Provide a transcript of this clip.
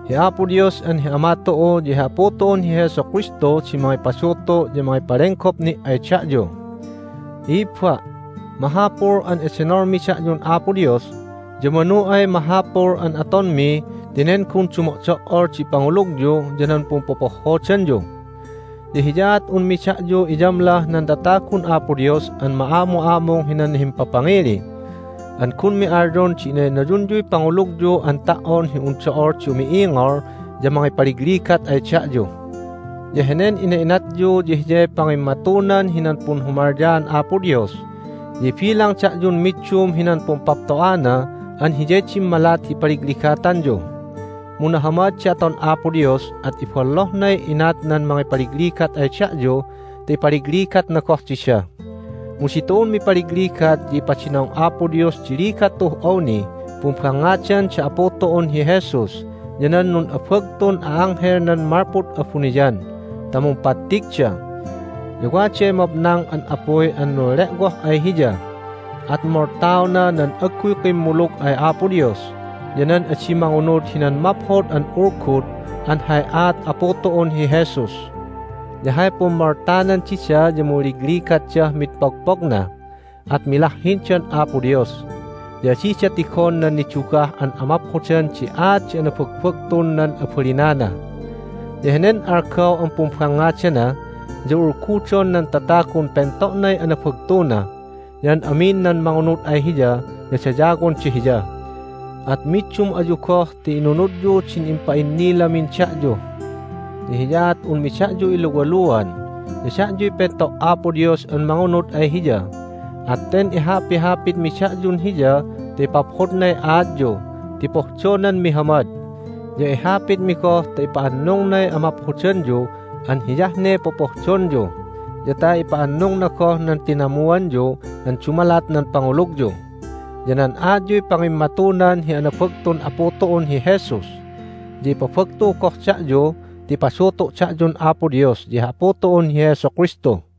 Hi Apo Dios an hi Ama tu'u ya hi Apu tu'un hi Jesu Kristu di mangipadutu' ya mangipalenggop ni' ay da'yu. I'ibba', mahapul an edenolmi da'yun Apo Dios, ya manu ay mahapul an atonmi ti nen gun dumo'do"ol di pangulugyu ya nan pumpopohhodanyu. Ya hiyaat unmi da'yu iyamlah nan tatagun Apo Dios an ma'amu'amung hinan himpapangili. An gunmi alyon di innaynayunyuy pangulugyu an ta"on hi un do'ol di umi'ingol ya mangipaligligat ay da'yu. Ya henen ina'inatyu ya hiyay pangimmatunan hinan punhumalyaan Apo Dios, ya ibilang da'yun middum hinan pumpapto'ana an hiyay dimmalat hi ipaligligatanyu. Mu nahamad di aton Apo Dios, at ibollohnay inat nan mangipaligligat ay da'yu ta ipaligligatna goh dida. Mu ditu'un mipaligligat ya ipadinong Apo Dios di ligat tu'uh awnih pumbangngadan da Apu tu'un hi Jesus ya nan nun'abagtun a'anghelnan malpud abuniyan ta mumpattigda. Ya waday mabnang an apuy an nunle'woh ay Hiya, at moltaona nan agguy kimmulug ay Apo Dios ya nan adi mangunud hinan Maphod an Ulgud an hay aat Apu tu'un hi Jesus. Ya hay pummoltanan dida ya munligligatdah mid pogpogna, at milahhindan Apo Dios, ya adida tigon nan nidugah an amaphodan di aat di anabagbagtun nan abalinana. Ya henen algaw an pumbangngadana ya ulgudon nan tatagun pento'nay anabagtuna, ya an amin nan mangunud ay Hiya ya dayawonda Hiya. At middum ayu goh ti inunudyu din impa'innilamin da'yu. Ya hiyaat unmi da'yu iluwaluwaluan. Ya da'yuy pento' Apo Dios an mangunud ay Hiya, at ten ihapihapitmi da'yun Hiya ta ipaphodnay aatyu ti pohdonan mihamad. Ya ihapitmi goh ta ipa'annungnay amaphodanyu an hiyah ne popohdonyu, ya ta ipa'annungna goh nan tinamuanyu an dumalat nan pangulugyu. Ya nan aatyuy pangimmatunan hi anabagtun Apu tu'un hi Jesus. Ya ipabagtu goh da'yu ti ipadutu' da'yun Apo Dios ya hi Apu tu'un hi Jesu Kristu.